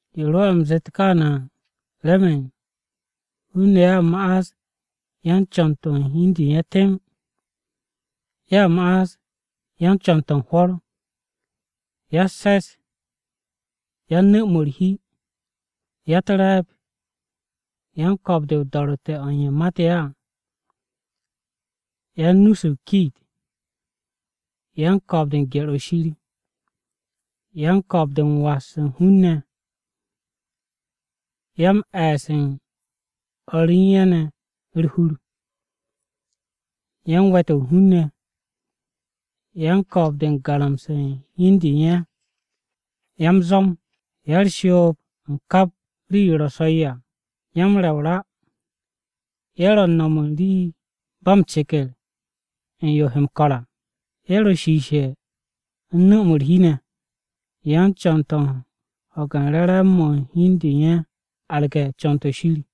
Yo rwo̱'e̱ u̱m zeet kaane̱ à, remen: Hun-ne̱ ye̱a ma'as yan-co̱n-to̱ u̱n hi u̱n de u̱n ye̱ temb. Ye̱a ma'as yan-co̱n-to̱ u̱n hwo̱r, Ya-u̱s-se̱s, Yan-nu̱-mo̱ u̱r-hi, Ya-u̱t-re̱e̱b, Yan-ko̱o̱b-de o-do̱ro̱tte̱ o̱ u̱n ye̱ mate̱ ye̱ à, Yan-nu-se u̱n o-kiit, Yan-ko̱o̱b-de u̱n gye̱r-o̱ Shir. Yan-ko̱o̱b-de m-was u̱n hun-ne̱ ne̱, Ya-m-e̱e̱s u̱n o̱r re u̱n ye̱ ne̱ u̱r-hur, Yan-we̱-to̱ hun-ne̱, Yan-ko̱o̱b-de u̱n garamse̱ u̱n hi u̱n de u̱n ye̱, Ya-m-zwo̱m, Ya-u̱r-shoob u̱n kap rii-yo ro̱ so̱-yo à. Ya-m-re̱ o-ra, Ye̱ ro̱ u̱n no̱m u̱n rii ba m-ceker u̱n yo he m-ko̱r à, Ye̱ ro̱ shiishe̱ u̱n nu̱-mo̱ u̱r-hi ne̱, Yan-co̱n-to̱ u̱n ho̱ge̱ u̱n re̱re̱m-mo̱ u̱n hi u̱n de u̱n ye̱ arge̱ co̱n-to̱ Shir,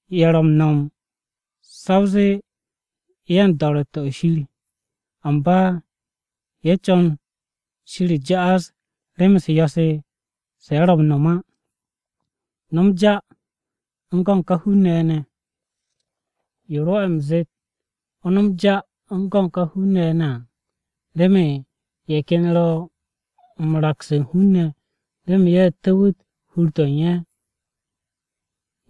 Ye̱ ro̱ m-no̱m sa o zee ye̱ u̱n do̱ro̱tte̱-o̱ Shir. Amba ye̱ m-co̱n Shir ja'as rem-u̱s yo̱-se, se̱ ye̱ ro̱ m-no̱m á. No̱m ja u̱n go̱n ka hun-ne̱ ye̱ ne̱. Yo rwo̱'e̱ u̱m zeet o no̱m ja u̱n go̱n ka hun-ne̱ ye̱ ne̱ à, remen ye̱ ken ye̱ ro̱ m-raks hun-ne̱ remen ye̱ tu̱wu̱t hur-to̱ u̱n ye̱.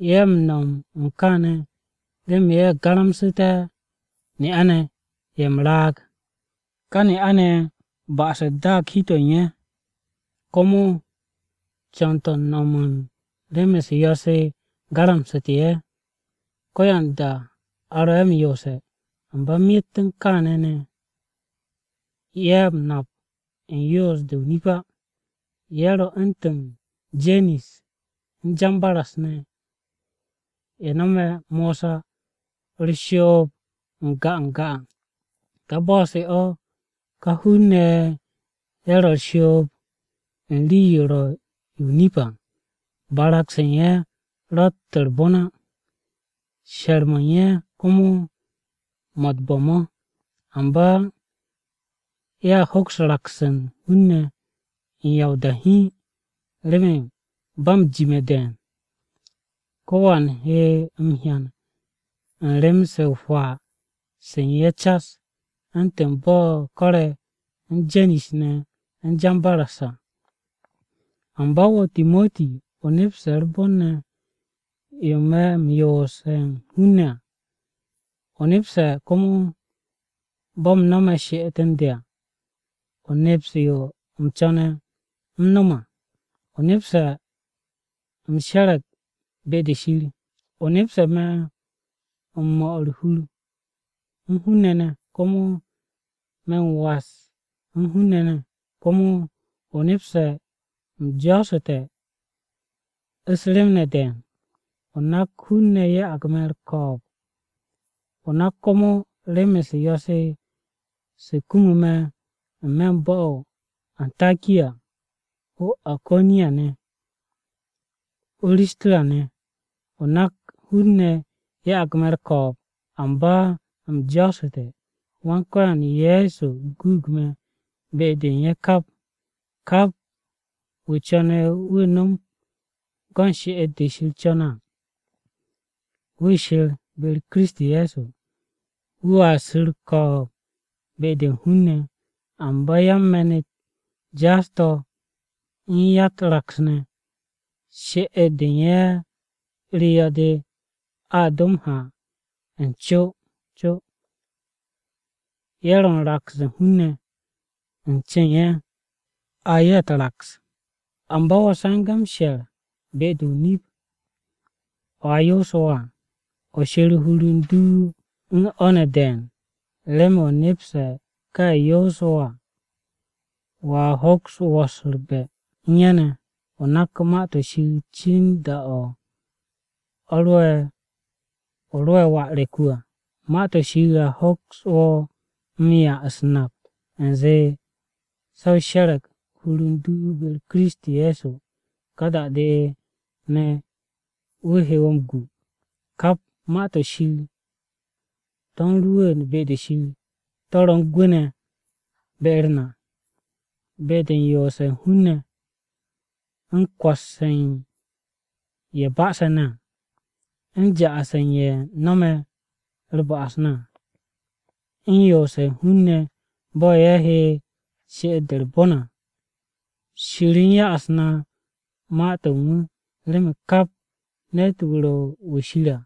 Ye̱ m-no̱m u̱n kaane̱ remen ye̱ garamsu̱té̱ ne'a-ne̱ ye̱ m-raag. Ka ne'a-ne̱ ye̱ ba'as-u̱t daag u̱n hi-to̱ u̱n ye̱, komo co̱n-to̱ u̱n no̱m u̱n rem-u̱s yo̱-se garamsu̱te̱ ye̱. Ko̱yanda a ro̱ ye̱ m-yoose̱, amba myet u̱n kaane̱ ne̱, ye̱ wo̱ m-nap u̱n yoos-de o-nip á. Ye̱ ro̱ u̱ntu̱n Jenis u̱n Jambaras ne̱ ye̱ nome̱ Mosa u̱r-shoob n-ga n-ga à. Ka bo̱-se o̱, ka hun-ne̱ ye̱ ro̱ u̱r-shoob u̱n rii-yo ro̱ o-nip à. Barag-se u̱n ye̱ ro̱tt u̱r-bon á, she̱r-mo̱ u̱n ye̱ komo mo̱ u̱t-bo̱ mo̱. Amba ye̱a hoks raks u̱n hun-ne̱ u̱n ya o-da hiin. Remen ba m-jime̱ de̱e̱n, ko̱wan he m-hyan u̱n rem-se o-hwaa se u̱n ye̱ cas, u̱ntu̱n bo̱ ko̱re̱ u̱n Jenis ne̱ u̱n Jambaras à. Amba wo̱, Timoti, o nepse̱ u̱r-bon ne̱, yo me̱ m-yoose̱ u̱n hun-ne̱ à. O nepse̱ komo bo̱ u̱m no̱me̱ she'et u̱n de à. O neps yo u̱m co̱ne̱ u̱m nom à. O nepse̱ u̱m she̱re̱g be-de Shir. O nepse̱ me̱ u̱n 'mo̱ u̱r-hur u̱n hun-ne̱ ne̱, komo me̱ u̱n was u̱n hun-ne̱. Komo o nepse̱ u̱m jo̱o̱su̱te̱ u̱s-rem de̱e̱n. O nak hun-ne̱ ya'ag me̱ u̱r-ko̱o̱b. O nak komo rem-u̱s yo̱-se se kumu me̱ n-me̱ bo̱-to̱ o-Antakiya, o-Iko̱niya ne̱, o-Risiya ne̱. O nak hun-ne̱ ya'ag me̱ u̱r-ko̱o̱b, amba u̱m jo̱o̱su̱te̱, Wan-Ko̱yan Ye̱so guug me̱ be-de u̱n ye̱ kap. Kap wu̱ co̱ne̱ wu̱ no̱m go̱n she'et-de Shir co̱ne̱ à, wu̱ she̱r be-u̱r Kiristi Ye̱so, wu̱a su̱ u̱r-ko̱o̱b be-de u̱n hun-ne̱. Amba yan-me̱n-u̱t jaas-to̱, u̱n ya-u̱t-raks ne̱, she'et-de u̱n ye̱ u̱r-yo̱-de a do m-ha n-co n-co. Ye̱ ro̱ u̱n raks u̱n hun-ne̱, u̱n ce u̱n ye̱, a ye̱ u̱t-raks. Amba wo̱, se̱nge̱ m-she̱r be-de o-nip o̱ a yoose̱ wo̱ à. O she̱r hur u̱n du u̱n o̱ ne̱ de̱e̱n, remen o nepse̱ ka ye̱ yoose̱ wo̱ à, wo̱a hoks wo̱s u̱r-be̱ u̱n ye̱ ne̱. O nak Ma-to̱ Shir cin da-o̱ o ro'e̱ wà re̱k-wu̱ à. Ma-to̱ Shir a hoks wo̱ m-'ya u̱s-nap u̱nze se̱ o she̱re̱g u̱r-hur be-u̱r Kiristi Ye̱so, ka da-de ne̱ wu̱ he wo̱ m-gwu̱. Kap Ma-to̱ Shir to̱ ro̱ gense̱ à, to̱ u̱n rwu̱u̱n be-de Shir. To̱ ro̱ u̱n gwu̱ ne̱ be-u̱r na: Be-de u̱n yoose̱ u̱n hun-ne̱, u̱n kwo̱s u̱n ye̱ ba'ase̱ ne̱ à, u̱n ja'as u̱n ye̱ no̱me̱ u̱r-ba'as à, u̱n yoose̱ hun-ne̱ bo̱ ye̱ he she'et-de u̱r-bon à. Shir u̱n ya'as na Ma-to̱ u̱n wu̱ remen kap ne̱t-wu̱ ro̱ wu̱ Shir à,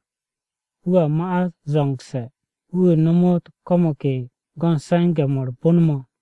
wu̱a ma'as zo̱ngse̱, wu̱ nomot ko̱ mo̱ ke go̱n se̱nge̱-mo̱ u̱r-bon mo̱.